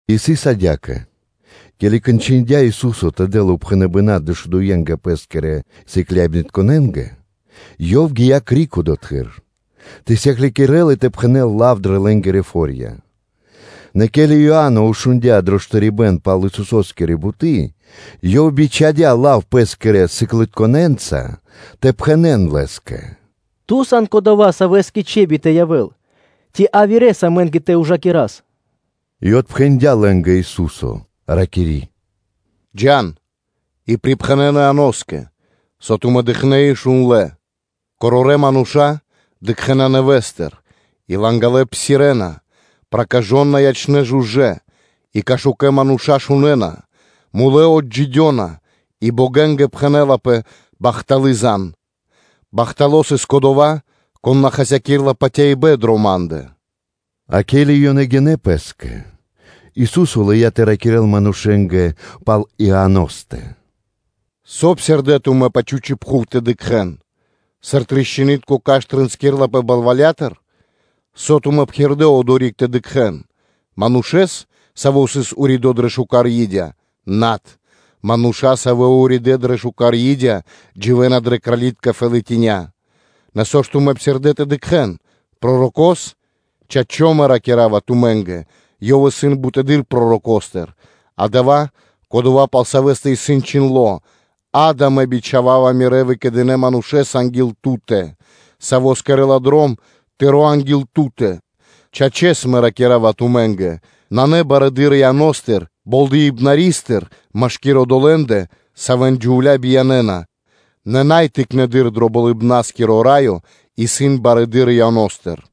И сыс адя́кэ: ке́ли кончындя Ису́со тэ дэл упхэныбэна́ дэшудуенгэ Пэ́скирэ сыкляибнытконэ́нгэ, Ёв гия́ криг одотхы́р тэ сыклякирэ́л и тэ пхэнэ́л лав дрэ лэ́нгирэ (Галилеякирэ) фо́рья. Нэ ке́ли Иа́но шундя́ дро штарибэ́н пал Исусо́скири буты́, ёв бичхадя́ лав пэ́скирэ сыкляибнытконэ́нца тэ пхэнэ́л Лэ́скэ: “Ту сан Кодова́, Савэ́скэ трэй тэ явэ́л, ци явирэ́с амэ́нгэ тэ ужакирас?” И отпхэндя́ лэ́нгэ Ису́со, ракири́ “Джа́н и пирипхэнэн Ианоскэ, со тумэ́ дыкхнэ́ и шундлэ́. Корорэ́ мануша́ дыкхэ́на нэвэ́стыр и лангалэ псирэ́на; проказытка ячэ́на жужэ́, и кашукэ мануша́ шунэ́на, мулэ́ отджидёна, и богэнгэ пхэнэ́лапэ бахталы́ зан (звесь); бахтало́ сыс кодова́, кон на хасякирэ́ла патяибэ́н дрэ Ма́ндэ. А ке́ли ёнэ гинэ́ пэ́скэ, Ису́со лыя́ тэ ракирэ́л манушэ́нгэ пал Ианостэ: “Со псирдэ́ тумэ́ тэ дыкхэ́н пэ чхучи́ пхув? Сыр тришчынытко кашт (дрэ́во) тринскирлапэ балвалятыр? Со тумэ́ псирдэ́ одори́к тэ дыкхэ́н? Манушэ́с, саво́ сыс уридо́ дрэ шука́р и́дя? Над; мануша́, савэ́ уридэ́ дрэ шука́р и́дя, дживэ́на дрэ кралитка фэлатиня́ (колова́). Нэ, со ж тумэ́ псирдэ́ тэ дыкхэ́н? Пророко́с? Чачо́, Мэ ракира́ва тумэ́нгэ: ёв исын барэды́р пророкостыр: дава́ исын кодова́, пал савэ́стэ исын чхиндло́: ‘Акэ, Мэ бичхава́ва Мирэ́ выкэдынэ́ Манушэ́с анги́л Ту́тэ, Саво́ кэрэ́ла дром Тыро́ анги́л Ту́тэ.’ Чачэс, Мэ ракира́ва тумэ́нгэ: нанэ барэды́р Иано́стыр Болдэипнаристыр машки́р одолэ́ндэ, савэ́н джувля́ биянэна, нэ най тыкнэды́р дро Болыбна́скиро Раё исын барэды́р Иано́стыр.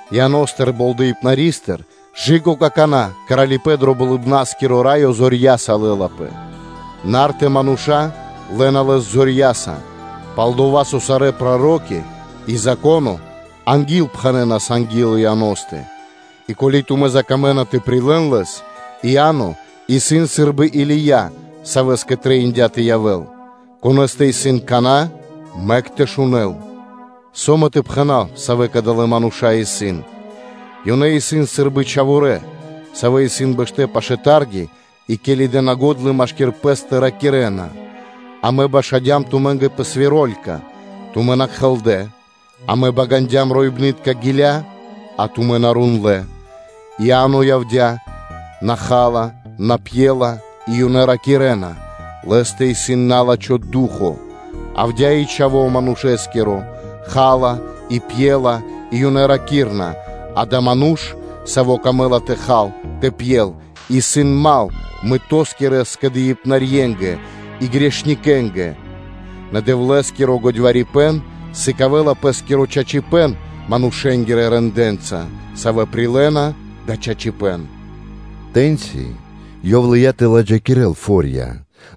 Ианоскирэ Болдэипнарискирэ дывэсэ́ндыр кэ/жы́ко какана́ Кралипэ́н дро Болыбна́скиро Раё зорья́са лэ́лапэ, нарта (упорна) мануша́ лэ́на лэс зорья́са. Пал-дова́ со сарэ́ проро́ки и Зако́но ангилпхэнэнас анги́л Ианостэ. И ко́ли тумэ́ закамэна тэ прилэ́н лэс, Иа́но исын сы́рбы Или́я, савэ́скэ трэиндя́ тэ явэ́л. Конэ́стэ исын кана́, мэк тэ шунэ́л. Со Мэ тэ пхэна́в, савэ́ кадалэ́ мануша́ исын? Ёнэ исын сы́рбы чхаворэ́, савэ́ исын бэштэ́ пашы́л тарги и ке́ли дэ́на го́дла машки́р пэ́стэ, то ёнэ ракирэ́на: ‘Амэ башадям тумэ́нгэ пэ свиролька, тумэ́ на кхэлдэ; амэ багандям роибнытка гиля́, а тумэ́ на рундлэ.’ И Иа́но явдя́, на ха́ла, на пьела, и ёнэ ракирэ́на: ‘Лэ́стэ исын на́лачхо ду́хо (фа́но).’ Явдя́ и Чхаво́ Манушэ́скиро, ха́ла, и пьела, и ёнэ ракирэ́на: ‘Дава́ исын ману́ш, савэ́скэ исын пир ило́ тэ хал, тэ пьел, исын дру́го (мал) мытоскирэ скэдыибнарьенгэ и грэхэнгирэнгэ.’ Нэ Дэвлэ́скиро годьварипэн сыкавэ́ла пэ́скиро чачипэ́н манушэ́нгирэ рэндэ́нца (делэнца), савэ́ прилэ́на дава́ чачипэ́н.” Тэ́ньци Ёв лыя́ тэ ладжакирэл фо́рья,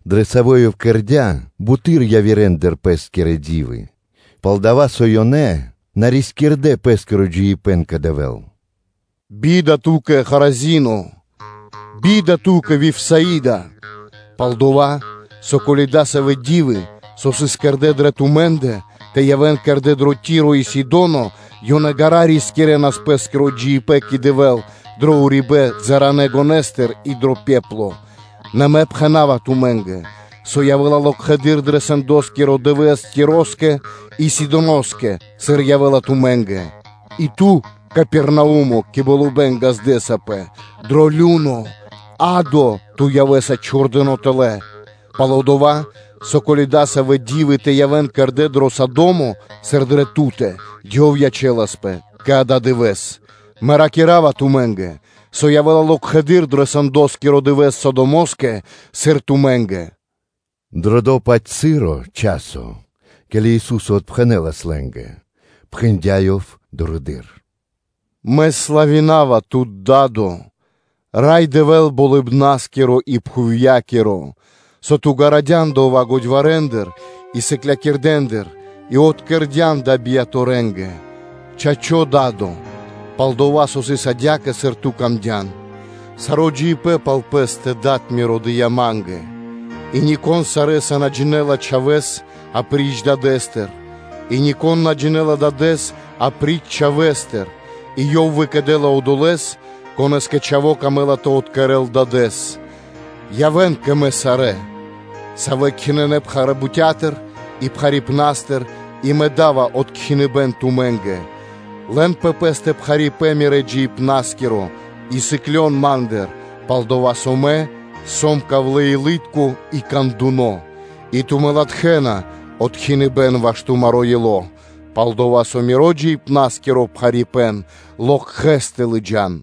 дрэ савэ́ Ёв кэрдя́ буты́р явирэндыр Пэ́скирэ ди́вы, пал-дова́ со ёнэ на рискирдэ́ пэ́скиро джиибэ́н кэ Дэвэ́л: “Бида ту́кэ, Хоразино! Бида ту́кэ, Вифсаида! Пал-дова́ со, ко́ли дасавэ́ ди́вы, со сыс кэрдэ́ дрэ тумэ́ндэ, тэ явэ́н кэрдэ́ дрэ Ти́ро и Сидоно, ёнэ ґара́ рискирэнас пэ́скиро джиибэ́н кэ Дэвэ́л дро урибэ́н балытконэ гонэстыр и дро пепло. Нэ Мэ пхэна́ва тумэ́нгэ, со явэ́ла локхэды́р дро сэндоскиро дывэ́с Тироскэ и Сидоноскэ, сыр явэ́ла тумэ́нгэ. И ту, Капернаумо, кэ болыбэ́н ґаздэсапэ? Дро лю́но (адо) ту явэ́са чхурдыно́ тэлэ́: пал-дова́ со, ко́ли дасавэ́ ди́вы тэ явэ́н кэрдэ́ дро Содо́мо, сыр дрэ ту́тэ, ёв ячэласпэ кэ ададывэ́с. Мэ ракира́ва тумэ́нгэ, со явэ́ла локхэды́р дро сэндоскирэ дывэ́с Содомоскэ, сыр ту́кэ.” Дро до-паць часо, ке́ли Ису́со отпхэнэ́лас лэ́нгэ, пхэндя́ Ёв дурэды́р: “Мэ славинава Тут, Да́до, Рай Дэвэ́л Болыбна́скиро и пхувья́киро, со Ту ґарадян дава́ годьварэндыр и барэ́-годякирэндыр, и откэрдян дава́ бияторэнгэ; Чачо́, Да́до, пал-дова́ со сыс адя́кэ, сыр Ту́кэ трэиндя́. Саро́ джиныбэ́н пал Пэ́стэ Дад Миро дыя́ Ма́нгэ, и нико́н сарэ́са на джинэ́ла Чхавэ́с апри́ч Дадэ́стэ и нико́н на джинэ́ла Дадэ́с апри́ч Чхавэ́стэ, и Ёв выкэдэ́ла одолэ́с, конэ́скэ Чхаво́ камэ́ла тэ откэрэл Дадэ́с. Явэ́н кэ мэ сарэ́, савэ́ кхинынэ пхарэ́ бутя́тыр и пхарипнастыр, – и Мэ да́ва откхиныбэн тумэ́нгэ. Лэн пэ пэ́стэ пхарипэ́н Мирэ́ джиибна́скиро и сыклён Ма́ндыр, пал-дова́ со Мэ сом ковлэ́-илытко и кандуно, и тумэ́ латхэ́на откхиныбэн ваш тумаро́ ило́; пал-дова́ со Миро джиибна́скиро пхарипэ́н локхэс тэ лыджа́н.”